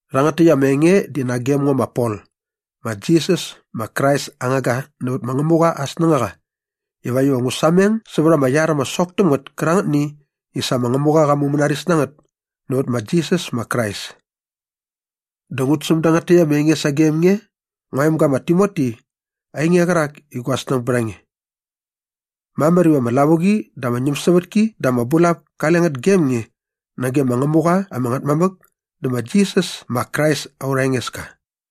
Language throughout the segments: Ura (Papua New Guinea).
Rhangät täkt ama enge di nagem ngo ma Pol ma Jisas ma Krais aa ngangga nävät ma Ngämuqa aa snängaqa ivakt iva ngu sameng sävät ama iar ama sok täm ngät kärangätni i sa ma Ngämuqa qa mumänaris na ngät nävät ma Jisas ma Krais. Dä ngut säm dangät täkt ama enge sagem nge ngua emga ma Timoti ainge qärak i gua snäng bät a nge. Mamär iva ama lavuqi dä ama ñämsävätki dä ama bulap kale ngät gem nge nage ma Ngämuqa ama Ngätmamäk dä ma Jisas ma Krais aurha Engeska.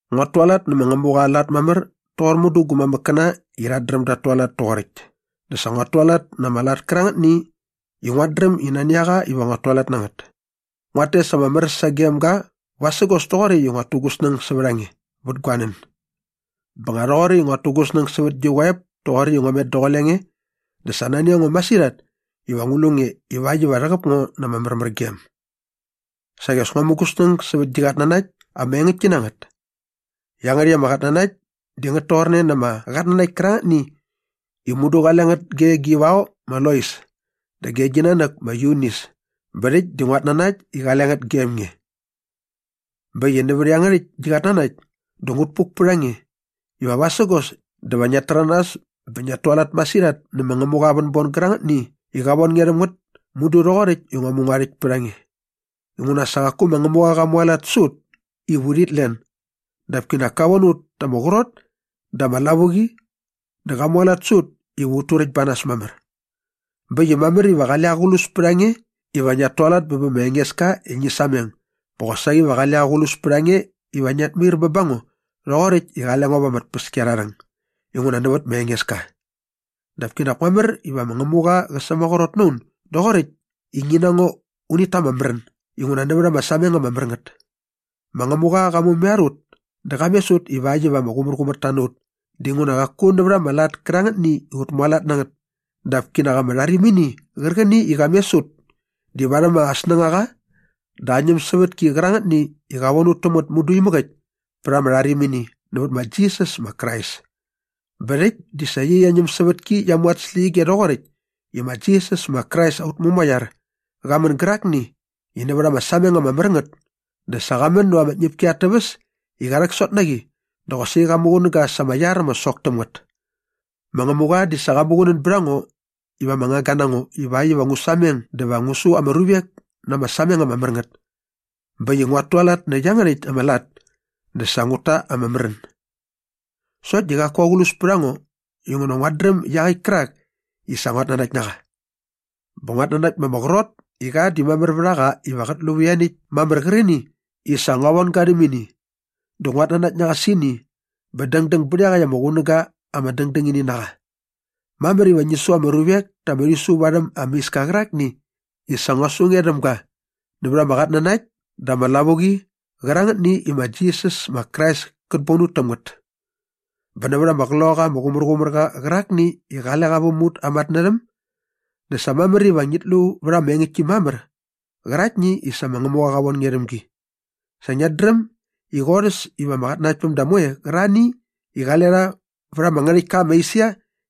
Nguat tualat nä ma Ngämuqa aa lat mamär toqor mudu gu mamäkkäna i rhat dräm dat tualat toqoräkt dä sa nguat tualat na ama lat kärangätni i nguat dräm i nani a qa iva nguat tualat na ngät. Dä nguat tes ama mär sagem ga vasägos toqoräkt i nguat tu gu snäng sävät a nge vät gua nän. Bä nga rhoqoräkt i nguat tu gu snäng sävät gi qoep toqoräkt i ngua met daqule nge dä sa nani a ngo masirhat iva ngu lu nge ivakt iva rhäqäp ngo na ama märmärgem. Saqi as ngua mu gu snäng sävät gi qatnanakt ama engäktki na ngät. Iangärhäkt ama qatnanakt di ngät toqorne na ama qatnanakt kärangätni i mudu qale ngät ge gi vao ma Lois dä ge gi nanäk ma Yunis bä rhäkt di nguat nanakt i qale ngät gem nge. Bä äkt i nävät iangärhäkt gi qatnanakt dä ngut puk pät a nge iva vasägos dä va ngiat täranas bä ngiat tualat masirhat nä ma Ngämuqa aa vänbon gärangätni i qa von nge rhäm ngät mudu rhoqoräkt i ngua mu ngua rhäkt pät a nge inguna sa qaku ma Ngämuqa qa mualat sä ut iva urhit len dap kinak ka von ut ta ama qrot dä ama lavuqi dä qa mualat sä ut iva ut turäkt ba nas mamär. Bä äkt i mamär iva qale aqlus pät a nge iva ngiat tualat bä bä ma Engeska i ngi sameng bä qosaqi va qale aqlus pät a nge iva ngiat mair bä ba ngo rhoqoräkt i qale ngo va ama tpäskiarharhäng inguna nävät ma Engeska. Dap kinak mamär iva ma Ngämuqa qä sämaqrot na un doqoräkt i ngi na ngo unit ta ama märän inguna nävät ama sameng ama mär ngät. Ma Ngämuqa qa mumaiar ut dä qa mes ut ivakt iva ama qumärqumärta na ut dinguna qaku nävät ama lat kärangätni i ut mualat na ngät dap kinak ama rharimini qärqäni i qa mes ut di varhäm aa snängaqa dä aa ñämsävätki qärangätni i qa von ut täm ngät mudu imäk äkt pät ama rharimini nävät ma Jisas ma Krais. Bä rhäkt di sa iaqyäkt ama ñämsävätki qia mu at släqyige rhoqoräkt i ma Jisas ma Krais aut Mumaiar qa män gärakni i nävät ama sameng ama mär ngät dä sa qa män näva ama tñäpki at täväs i qa rhäksot na qi dä qosaqi qa muqunäga sa ama iar ama sok täm ngät. Ma Ngämuqa di sa qa muqunän bät a ngo iva ama ngangga na ngo ivakt iva ngu sameng dä va ngu su ama ruvek na ama sameng ama mär ngät bä äkt i nguat tualat nä iangärhäkt ama lat dä sa ngut ta ama märän. Sokt di qaku aqlus pät a ngo inguna nguat dräm iaqäkt kärak i sa nguat nanakt na qa. Bä nguat nanakt ma ama qrot i qa di mamär vät a qa iva qät lu vät ianiäkt mamär qärqäni i sa ngua von ga rhäm ini dä nguat nanakt na qa sä ini bä dängdäng bät iaqäkt ama qunäga ama dängdängini na qa. Mamär iva ngi su ama ruvek ta ama rhisu varhäm ama iska qärakni i sa ngua su nge rhäm ga nävät ama qatnanakt dä ama lavuqi qärangätni i ma Jisas ma Krais kät bon ut täm ngät. Bä nävät ama Qloqaqa ama Qumärqumärqa qärakni i qale qa väm ut aa matnärhäm dä sa mamär iva ngit lu vät ama engäktki mamär qäraktni i sa ma Ngämuqa qa von nge rhäm gi. Sa ngiat dräm i qorhäs iva ama qatnanaktpämda moe qärarhani i qale rha vät ama ngärhäktka ma Esia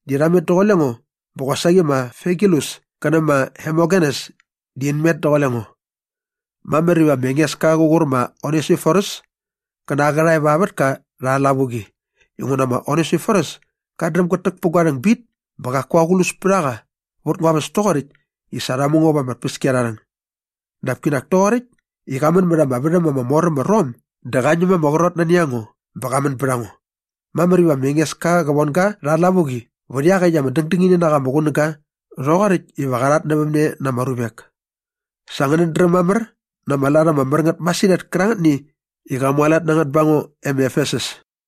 di rha met daqule ngo bä qosaqi ma Figelus kä nä ma Hermogenes di in met daqule ngo. Mamär iva ma Engeska qär qur ma Onesiforus kä na aa qärhae va aa vätka rha aa lavuqi inguna ma Onesiforus kat dräm gät täk pä gua rhäng bit bä qaku aqlus pät a qa vät ngua väs toqoräkt i sa rha mu ngo va ama tpäskiarharhäng. Dap kinak toqoräkt i qa män mät ama värhäm ama mor äm ma Rom dä qa ñäm ma ama qrot nani a ngo bä qa män bät a ngo. Mamär iva ma Engeska qä von ga rha aa lavuqi vät iaqäkt ama dängdängini na qa ama qunäga rhoqoräkt iva qa rhatnävämne na ama ruvek. Sa ngänät dräm mamär na ama lat ama mär ngät masirhat kärangätni i qa mualat na ngät ba ngo e ma Efesus.